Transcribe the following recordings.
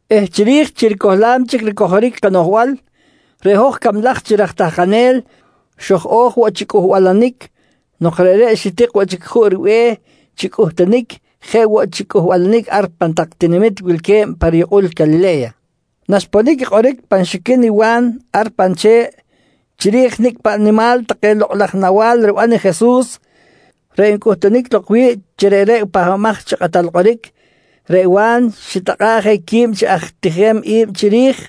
eh chiri̱j chi ricohlam chic ricojoric kanoꞌjbal, reꞌ hoj cablaj chi raj tahkanel xoj-o̱j woꞌ chi cꞌuhbalanic nok reꞌreꞌ xitik woꞌ chic juꞌ ribe̱h chi cꞌuhtunic jeꞌ woꞌ chi cꞌuhbalanic ar pan tak tinamit wilque̱b pa riyukꞌul Calile̱ya. Naxponic i kꞌoric pan xiquin i Wa̱n ar pan che̱ꞌ chiri̱j i nicꞌ paꞌ nimal take lokꞌ laj nawa̱l riban i Jesus, reꞌ ncꞌuhtunic lok wi̱ꞌ chi reꞌreꞌ i Pahbamaj chi Kꞌatal Kꞌoric, reꞌ Wa̱n xitakꞌa̱ꞌ je quib chi aj tijem i̱b chiri̱j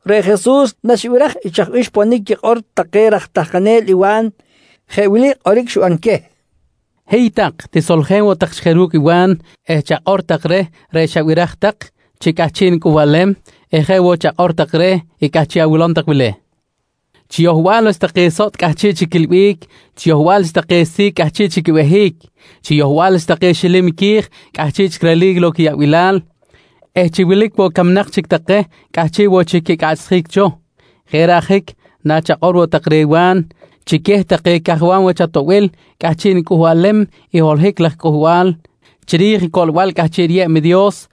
Reꞌ Jesus naxibiraj i chaj bih xponic quikꞌor take raj tahkanel i Wa̱n, jeꞌ wili kꞌoric xiban queh: «Hiy tak, tisoljen woꞌ tak chic je ru̱cꞌ i Wa̱n eh chakꞌor tak reh reꞌ xabiraj tak chi cꞌahchiꞌ nicꞌuhbalem eh jeꞌ woꞌ chakꞌor take reh i cꞌahchiꞌ awilom tak wili: Chi yohbal wach take sotꞌ cꞌahchiꞌ chic quiꞌilbic, chi yohbal wach take si̱c cꞌahchiꞌ chic quibehic, chi yohbal wach take xilim qui̱j cꞌahchiꞌ chic relic lok quiyaꞌbilal eh chi wilic woꞌ camnak chic take cꞌahchiꞌ woꞌ chic quicꞌaꞌchsjic cho. Jeꞌ reꞌ ajic, nachakꞌor woꞌ tak reh Wa̱n chi queh take cajwam wach atoꞌbil cꞌahchiꞌ nicꞌuhbalem i holohic laj cꞌuhbal chiri̱j i coꞌlbal cꞌahchiꞌ riyeb i Dios,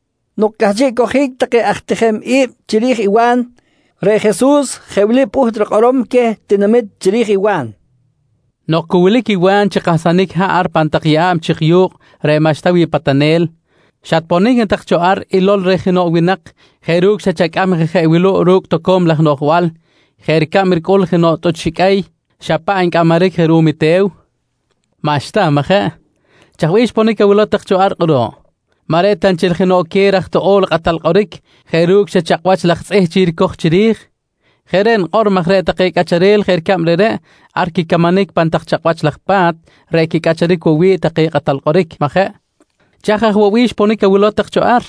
Nok cꞌahchiꞌ cojic take aj tijem i̱b chiri̱j i Wa̱n, reꞌ Jesus jeꞌ wili pꞌuht rikꞌorom queh tinamit chiri̱j i Wa̱n: «Nok cu wilic i Wa̱n chi kahsanic haꞌ ar pan tak yeꞌa̱b chik yu̱kꞌ reꞌ maꞌxta wi̱ꞌ patanel, xatponic na tak cho ar ilol reh jenoꞌ winak jeꞌ ru̱cꞌ xa chacꞌam je jeꞌ wuluꞌ ru̱cꞌ toco̱m laj noꞌjbal, jeꞌ ricab ricꞌul jenoꞌ tꞌuch xiqꞌuey xa paꞌ ncꞌamaric je ruꞌum i te̱w? Maꞌxta, majeꞌ? Chaj bih xponic awilow tak cho ar kꞌuruꞌ? Maꞌ reꞌ ta nchel jenoꞌ queh raj toꞌo̱l kꞌatal kꞌoric jeꞌ ru̱cꞌ xa chakꞌwach laj tzꞌih chic ricoj chiri̱j? Jeꞌ reꞌ nikꞌor maj reꞌ take cꞌacharel jeꞌ ricab reꞌreꞌ, ar quicamanic pan tak chakꞌwach laj pa̱t reꞌ quicꞌacharic woꞌ wi̱ꞌ take kꞌatal kꞌoric, majeꞌ? Chaj aj woꞌ bih xponic awilow tak cho ar?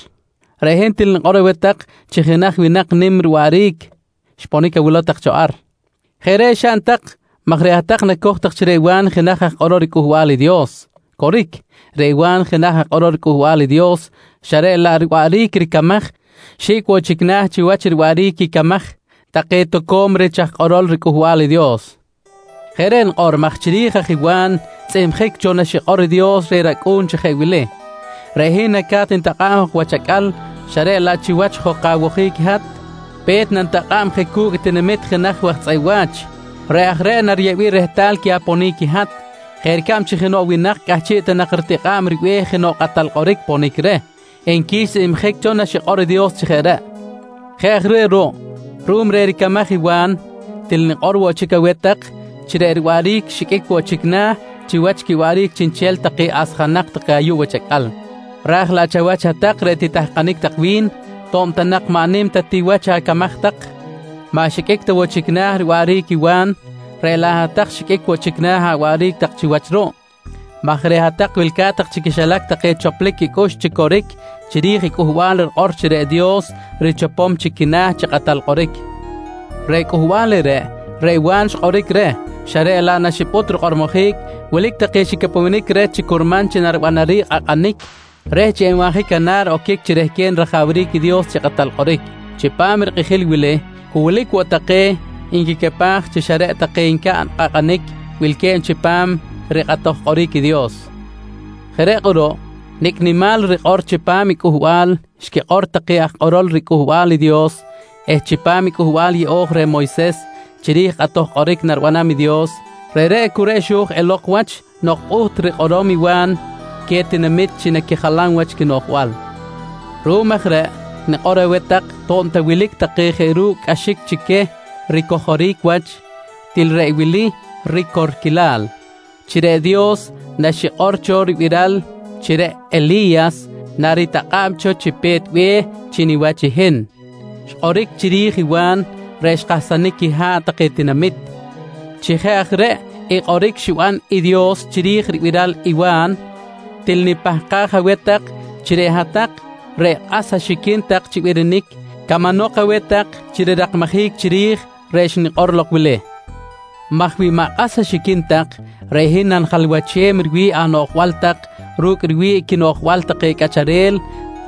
Reꞌ hin til nikꞌor aweh tak chi jenaj winak nim riwaꞌric xponic awilow tak cho ar. Jeꞌ reꞌ xaꞌn tak maj reꞌ hat-tak nacoj tak chi reꞌ Wa̱n jenaj aj kꞌorol riCꞌuhbal i Dios. Coric, reꞌ Wa̱n jenaj aj kꞌorol riCꞌuhbal i Dios, xa reꞌ laꞌ reꞌ riwaꞌric ricamaj xi̱cꞌ woꞌ chic na̱ chiwach riwaꞌric quicamaj take toco̱m rich aj kꞌorol riCꞌuhbal i Dios. Jeꞌ reꞌ nikꞌor maj chiri̱j aj i Wa̱n xtzꞌihmjic cho naxikꞌor i Dios reh rAcꞌu̱n chi jeꞌ wili: “Reꞌ hin naca̱t nitakꞌa̱b jok wach acꞌal, xa reꞌ laꞌ chiwach jok awojic i hat, pe̱t nanitakꞌa̱b je cu̱cꞌ i tinamit jenaj waj tzꞌeꞌ wa̱ch. Reꞌ aj reꞌ nariyeꞌbic rehtal queh aponic i hat, jeꞌ ricab chi jenoꞌ winak cꞌahchiꞌ ta nak ritikꞌa̱ꞌ ribe̱h jenoꞌ kꞌatal kꞌoric ponic reh, nqui xtzꞌihmjic cho naxikꞌor i Dios chi jeꞌ reꞌ. «Jeꞌ aj reꞌ ruꞌ, ruꞌum reh ricamaj i Wa̱n, til nikꞌor woꞌ chic aweh tak chi reꞌ riwaꞌric xiqꞌuic woꞌ chic na̱ chiwach quiwaꞌric chiꞌnchel take asjanak take ayuꞌ wach acꞌal. Raj laꞌ chawach hat-tak reꞌ titahkanic tak wi̱n, to̱b ta nak maꞌ nim ta ti wach acamaj tak, maꞌ xiqꞌuic ta woꞌ chic na̱ riwaꞌric i Wa̱n, reꞌ laꞌ hat-tak xiqꞌuic woꞌ chic na̱ awaꞌric tak chiwach ruꞌ maj reꞌ hat-tak wilca̱t tak chi quixilac take choplic quicꞌux chi coric chiri̱j i cꞌuhbal rikꞌor chi reꞌ Dios richopom chic quina̱ chi kꞌatal kꞌoric. Reꞌ cꞌuhbal reꞌreꞌ, reꞌ Wa̱n xkꞌoric reh xa reꞌ laꞌ naxipꞌut rikꞌormojic, wilic take xicapewenic reh chi curman naribanaric kꞌakꞌanic reh chi enbanjic canar oquic chi rehquen rajawric i Dios chi kꞌatal kꞌoric. Chipam i rikꞌijil wili cu wilic woꞌ take nquicapaj chi xa reꞌ take ncaꞌn i kꞌakꞌanic wilque̱b chipam rikꞌatoj kꞌoric i Dios. Jeꞌ reꞌ kꞌuruꞌ, nicꞌ nimal rikꞌor chipam i cꞌuhbal xquikꞌor take aj kꞌorol riCꞌuhbal i Dios eh chipam i Cꞌuhbal Yeꞌo̱j reh Moyses chiri̱j kꞌatoj kꞌoric naribanam i Dios, reꞌreꞌ cu reꞌ xo̱j elok wach nok pꞌuht rikꞌorom i Wa̱n queh tinamit chi naquijalam wach quinoꞌjbal. Ruꞌum aj reꞌ nikꞌor aweh tak to̱b ta wilic take jeꞌ ru̱cꞌ cꞌaxic chi queh ricojoric wach, til reꞌ wili ricorquilal: Chi reꞌ Dios naxikꞌor cho ribiral chi reꞌ Eli̱yas naritakꞌa̱b cho chi pe̱t be̱h chi niwach i hin, xkꞌoric chiri̱j i Wa̱n reꞌ xkahsanic quiha̱ꞌ take tinamit. Chi jeꞌ aj reꞌ i kꞌoric xiban i Dios chiri̱j ribiral i Wa̱n, til nipahkaj aweh tak chi reꞌ hat-tak reꞌ kꞌas axiquin tak chi birinic camanok aweh tak chi rirakmajic chiri̱j reꞌ xnikꞌor lok wili maj wi maꞌ kꞌas axiquin tak, reꞌ hin nanijalwachem riwi̱ꞌ anoꞌjbal tak ru̱cꞌ riwi̱ꞌ quinoꞌjbal take cꞌacharel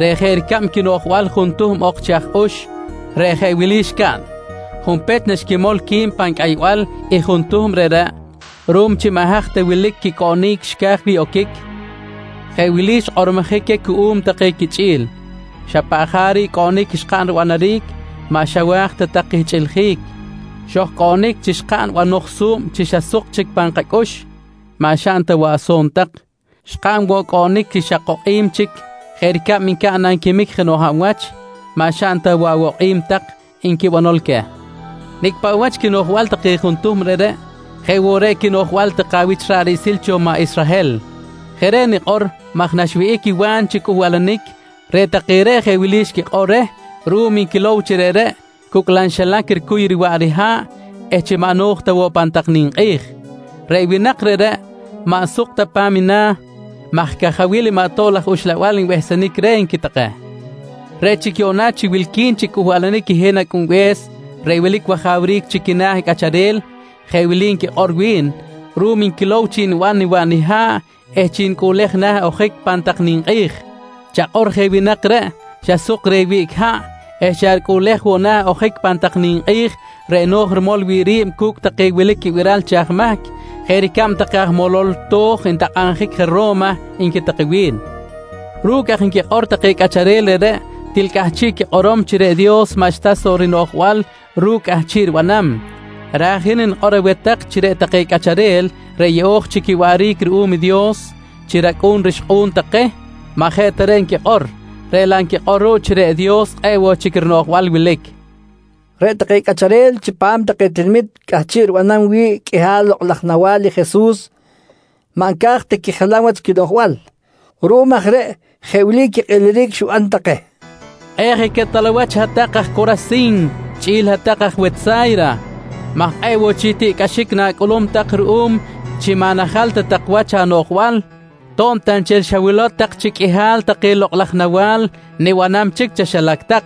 reꞌ jeꞌ ricab quinoꞌjbal juntuhm ok chi aj ux reꞌ jeꞌ wili xcaꞌn: Junpech naxquimol qui̱b pan cꞌaybal i juntuhm reꞌreꞌ, ruꞌum chi maꞌ haj ta wilic quicꞌoꞌnic xca̱j wi̱ꞌ oquic, jeꞌ wili xkꞌormojic queh cuꞌum take quichꞌi̱l: ‹Xa paꞌ jaric cꞌoꞌnic xkaꞌn ribanaric, maꞌ xawa̱j ta tak kihchꞌiljic. Xojcoꞌnic chi xkaꞌn banoj su̱b chi xa suk chic pan kacꞌux, maꞌ xaꞌn ta woꞌ aso̱n tak. Xkaꞌn woꞌ cꞌoꞌnic chi xa kokꞌim chic jeꞌ ricab ncaꞌn nanquimic jenoꞌ hab wach, maꞌ xaꞌn ta woꞌ awokꞌim tak, nqui banol queh. «Nicꞌ paꞌ wach quinoꞌjbal take juntuhm reꞌreꞌ, jeꞌ woꞌ reꞌ quinoꞌjbal take awich ra̱ꞌ riꞌsil cho maꞌ Israhel. Jeꞌ reꞌ nikꞌor maj naxwihꞌic i Wa̱n chi cꞌuhbalanic, reꞌ take reꞌ jeꞌ wili xquikꞌor reh ruꞌum nquilow chi reꞌreꞌ cucꞌlam xilac ricuy riwaꞌ riha̱ꞌ eh chi maꞌ no̱j ta woꞌ pan tak ninkꞌi̱j: ‹Reꞌ winak reꞌreꞌ, maꞌ suk ta pa̱m na̱ maj cajawil maꞌ tob laj uxlabal nbehsenic reh, nqui take. «Reꞌ chic yuꞌna chi wilqui̱n chi cꞌuhbalanic i hin Acꞌunbe̱s reꞌ wilic wajawric chi quina̱ cꞌacharel, jeꞌ wili nquikꞌor wi̱n ruꞌum nquilow chi niban niwaꞌ niha̱ꞌ eh chi nicꞌuꞌlej na̱ ojic pan tak ninkꞌi̱j: ‹Chakꞌor je winak reꞌ, xa suk reh wiꞌc haꞌ eh xa ricꞌuꞌlej woꞌ na̱ ojic pan tak ninkꞌi̱j reꞌ no̱j rimol wi̱ꞌ ri̱b cu̱cꞌ take wilic quibiral chi aj mahc, jeꞌ ricab take aj molol to̱j ntakꞌabjic je Ro̱ma, nqui take wi̱n. «Ru̱cꞌ aj nquikꞌor take cꞌacharel reꞌreꞌ, til cꞌahchiꞌ quikꞌorom chi reꞌ Dios maꞌxta soꞌ rinoꞌjbal ru̱cꞌ cꞌahchiꞌ ribanam, raj i hin nikꞌor aweh tak chi reꞌ take cꞌacharel reꞌ yeꞌo̱j chic quiwaꞌric ruꞌum i Dios chi racꞌu̱n rixkꞌu̱n take maꞌ jeꞌ ta reꞌ nquikꞌor, reꞌ laꞌ nquikꞌor ruꞌ chi reꞌ Dios kꞌe̱ꞌ woꞌ chic rinoꞌjbal wilic, nqui Jesus queh. Reꞌ take cꞌacharel chipam take tinamit cꞌahchiꞌ ribanam wi̱ꞌ qꞌuihal lokꞌ laj nawa̱l i Jesus, maꞌ nca̱j ta quijalam wach quinoꞌjbal. Ruꞌum aj reꞌ jeꞌ wili quikꞌiliric xiban take: «Kꞌe̱ꞌ je quetal awach hat-tak aj Corasin chꞌi̱l hat-tak aj Wetsa̱yra maj kꞌe̱ꞌ woꞌ chic tiꞌcꞌaxic na̱cꞌulum tak ruꞌum chi maꞌ najal ta tak wach anoꞌjbal to̱b ta nchel xawilow tak chi qꞌuihal take lokꞌ laj nawa̱l nibanam chic chaxilac tak.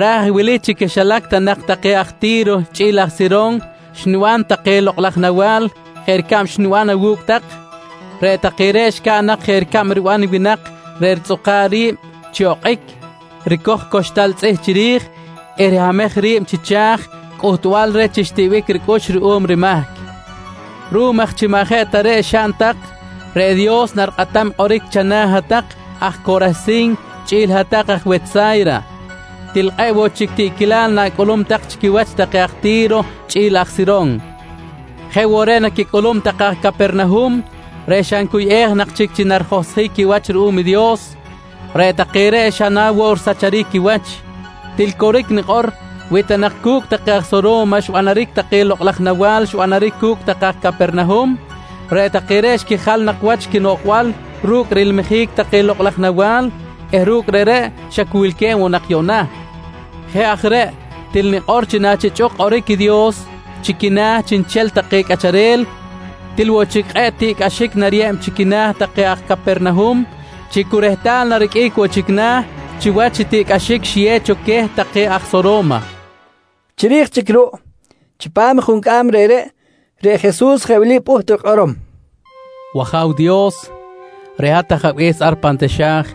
Raj wili chi quixilac ta nak take aj Ti̱ro chꞌi̱l aj Siron xniban take lokꞌ laj nawa̱l jeꞌ ricab xniban awu̱cꞌ tak, reꞌ take reꞌ xcaꞌn nak jeꞌ ricab riban winak reꞌ ritzꞌuka̱ꞌ ri̱b chi okꞌic, ricoj coxtal tzꞌih chiri̱j eh rihamej ri̱b chi cha̱j cꞌuhtbal reh chi xtiꞌbic ricꞌux ruꞌum rimahc. Ruꞌum aj chi maꞌ jeꞌ ta reꞌ xaꞌn tak, reꞌ Dios narikꞌatam kꞌoric chana̱ hat-tak aj Corasin chꞌi̱l hat-tak aj Wetsa̱yra. Til kꞌe̱ꞌ woꞌ chic tiꞌquilal na̱cꞌulum chi quiwach take aj Ti̱ro chꞌi̱l aj Siron. Jeꞌ woꞌ reꞌ naquicꞌulum take aj Capernahum reꞌ xa ncuyꞌej nak chic chi narijohsjic quiwach ruꞌum i Dios, reꞌ take reꞌ xa na woꞌ risacharic quiwach. Til coric nikꞌor, wi ta nak cu̱cꞌ take aj Soro̱ma xbanaric take lokꞌ laj nawa̱l xbanaric cu̱cꞌ take aj Capernahum, reꞌ take reꞌ xquijal nak wach quinoꞌjbal ru̱cꞌ rilmijic take lokꞌ laj nawa̱l eh ru̱cꞌ reꞌreꞌ xa cu wilque̱b woꞌ nak yuꞌna. Jeꞌ aj reꞌ, til nikꞌor chi nachichꞌuk kꞌoric i Dios chi quina̱ chiꞌnchel take cꞌacharel, til woꞌ chic kꞌe̱ꞌ tiꞌcꞌaxic nariyeb chi quina̱ take aj Capernahum chi cu rehtal nariqꞌuic woꞌ chic na̱ chiwach i tiꞌcꞌaxic xiyew cho queh take aj Soro̱ma, nqui Jesus. Chiri̱j chic ruꞌ, chipam i juncꞌam reꞌreꞌ, reꞌ Jesus jeꞌ wili pꞌuht rikꞌorom: «W-Aja̱w Dios, reꞌ hat, hat Ajabe̱s ar pan taxa̱j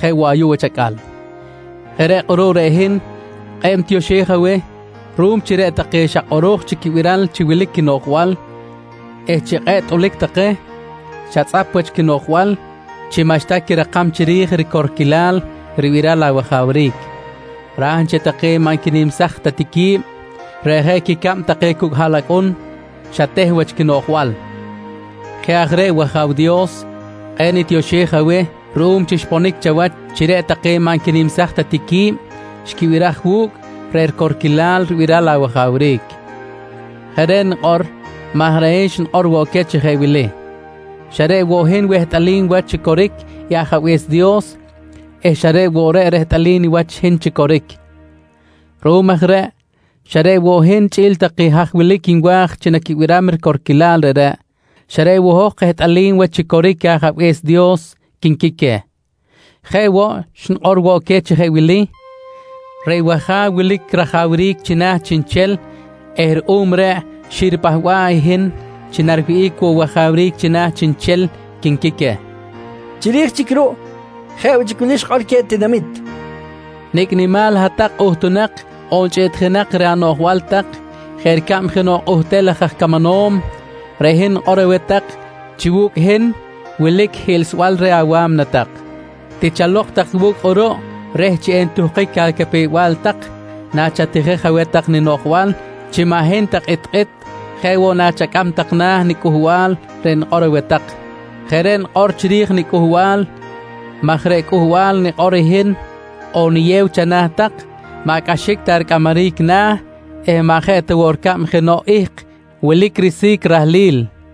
jeꞌ woꞌ ayuꞌ wach acꞌal. Jeꞌ reꞌ kꞌuruꞌ reꞌ hin kꞌe̱ꞌ nitioxej aweh ruꞌum chi reꞌ take xa kꞌoro̱j chic quibiral chi wilic quinoꞌjbal eh chi kꞌe̱ꞌ tꞌulic take, xatzꞌap wach quinoꞌjbal chi maꞌxta quirakam chiri̱j ricorquil ribiral awajawric, raj nchel take maꞌ nquinimsaj ta ti qui̱b, reꞌ jeꞌ quicab take cucꞌ haꞌlacꞌun, xateh wach quinoꞌjbal. Jeꞌ aj reꞌ wAja̱w Dios kꞌe̱ꞌ nitioxej aweh ruꞌum chi xponic chawach chi reꞌ take maꞌ nquinimsaj ta ti qui̱b xquibiraj wu̱cꞌ reꞌ ricorquilal ribiral awajawric. Jeꞌ reꞌ nikꞌor maj reꞌ hin xnikꞌor woꞌ queh chi jeꞌ wili: ‹Xa reꞌ woꞌ hin wehtꞌalim wach chi coric i Ajabe̱s Dios eh xa reꞌ woꞌ reꞌ rehtꞌalim niwach i hin chi coric. Ruꞌum aj reꞌ, xa reꞌ woꞌ hin chꞌi̱l take haj wilic nwa̱j chi naquibiram i ricorquilal reꞌreꞌ, xa reꞌ woꞌ hoj kehtꞌalim wach chi coric i Ajabe̱s Dios, quinqui queh. «Jeꞌ woꞌ, xnikꞌor queh chi jeꞌ wili: ‹Reꞌ wAja̱w wilic rajawric china̱ chiꞌnchel eh ruꞌum reꞌ xiripahba̱ꞌ i hin chi nariwihꞌic woꞌ wajawric china̱ chiꞌnchel, quinqui queh, nqui Jesus. Chiri̱j chic ruꞌ, jeꞌ woꞌ chic wili xikꞌor queh tinamit: «Nicꞌ nimal hat-tak kꞌuhtunak on chꞌiꞌtjinak reh anoꞌjbal tak jeꞌ ricab jenoꞌ kꞌuhtel laj aj camanom, reꞌ hin nikꞌor aweh tak chi wu̱cꞌ hin wilic hiꞌlsbal reh awa̱mna tak. Tichalok tak wu̱cꞌ kꞌuruꞌ reh chi entuhkic acapew-bal tak nachatijej aweh tak ninoꞌjbal chi maꞌ hin ta kꞌitkꞌit, jeꞌ woꞌ nachacꞌam tak na̱ niCꞌuhbal reꞌ nikꞌor aweh tak. Jeꞌ reꞌ nikꞌor chiri̱j niCꞌuhbal maj reꞌ cꞌuhbal nikꞌor i hin on niyew chana̱ tak, maꞌ cꞌaxic ta ricꞌamaric na̱ eh maꞌ jeꞌ ta woꞌ ricab jenoꞌ ihk wilic risi̱c rahlil, nqui queh.